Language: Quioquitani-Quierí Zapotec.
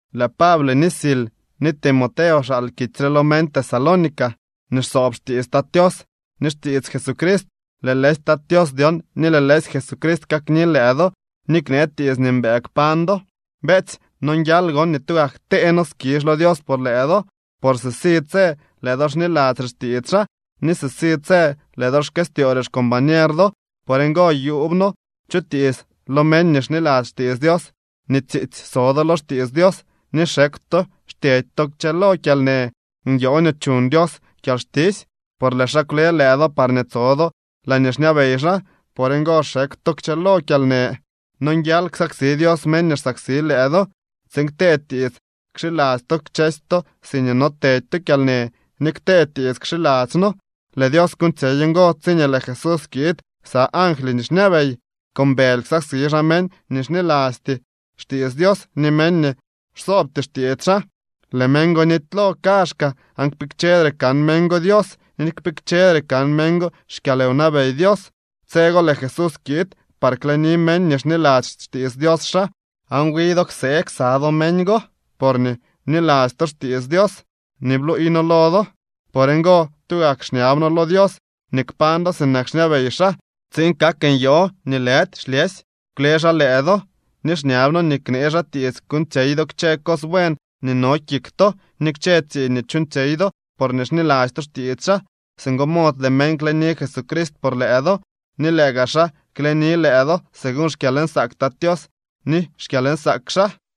Lëë Pable ni Sil ni Timoteo xaal kitsy re lo meñ Tesalónica nii xsoob xtiits Tat Tios ni xtiits Jesucrist. Lëë lëësy Tat Tios dyon ni lëë lëësy Jesucrist kakni lëë do ni knee tiits nii mbëë kpañ do. Beetsy, nonguial gon nii tugak ktee noo skizh lo Dios por lëë do, por sisi tse lëë do xniladzyre xtiits xaa ni sisi tse lëë do xkëstyoore xcombañer do. Por ngo, yuub noo chutiits lo meñ nii xniladzy xtiits Dios nii tsiitsy so do lo xtiits Dios ni xekw to xtyedy to kchëlo kyalnë. Nyoo nii chuñ Dios kyalxtisy, por lëë xaa kwle lëë do parñee tso do laañee xñabey xaa. Por ngo xekw to kchëlo kyalnë. Nonguial ksaksi Dios meñ nii xsaksi lëë do, tsiin ktee tiits kxiladzy to kchësy to siñee notedy to kyalnë ni ktee tiits kxiladzy noo. Lëë Dios kuuñtsyey ngo tsiñee lëë Jesús kiid ksa angly nii xñabey. Con bëly ksaksi xaa meñ nii xnilasty xtiits Dios ni meñ nii xsoobty xtiits xaa. Lëë meñ go nitylo kaazhkaa, aan kpikchedre kan meñ go Dios ni kpikchedre kan meñ go xkyalwnabey Dios. Tse go lëë Jesús kiid par kleni meñ nii xniladzy xtiits Dios xaa, aan wi do ksee ksa do meñ go porñee bniladzy to xtiits Dios nii bluuy noo lo do. Por ngo, tugak xñab noo lo Dios nii kpañ do sinak xñabey xaa tsiin kak nyoo nii lëdy xlyësy kwle xaa lëë do, ni xñab noo nii knee xaa tiits kuuñtsyey do kchë cos buen nii no kik to ni kchë tsiiñ nii chuuñtsyey do porñee xniladzy to xtiits xaa. Singo mod lëë meñ kleni Jesucrist por lëë do, ni lëë gaa xaa kleni lëë do según xkyalnsaak Tat Tios ni xkyalnsaak xaa.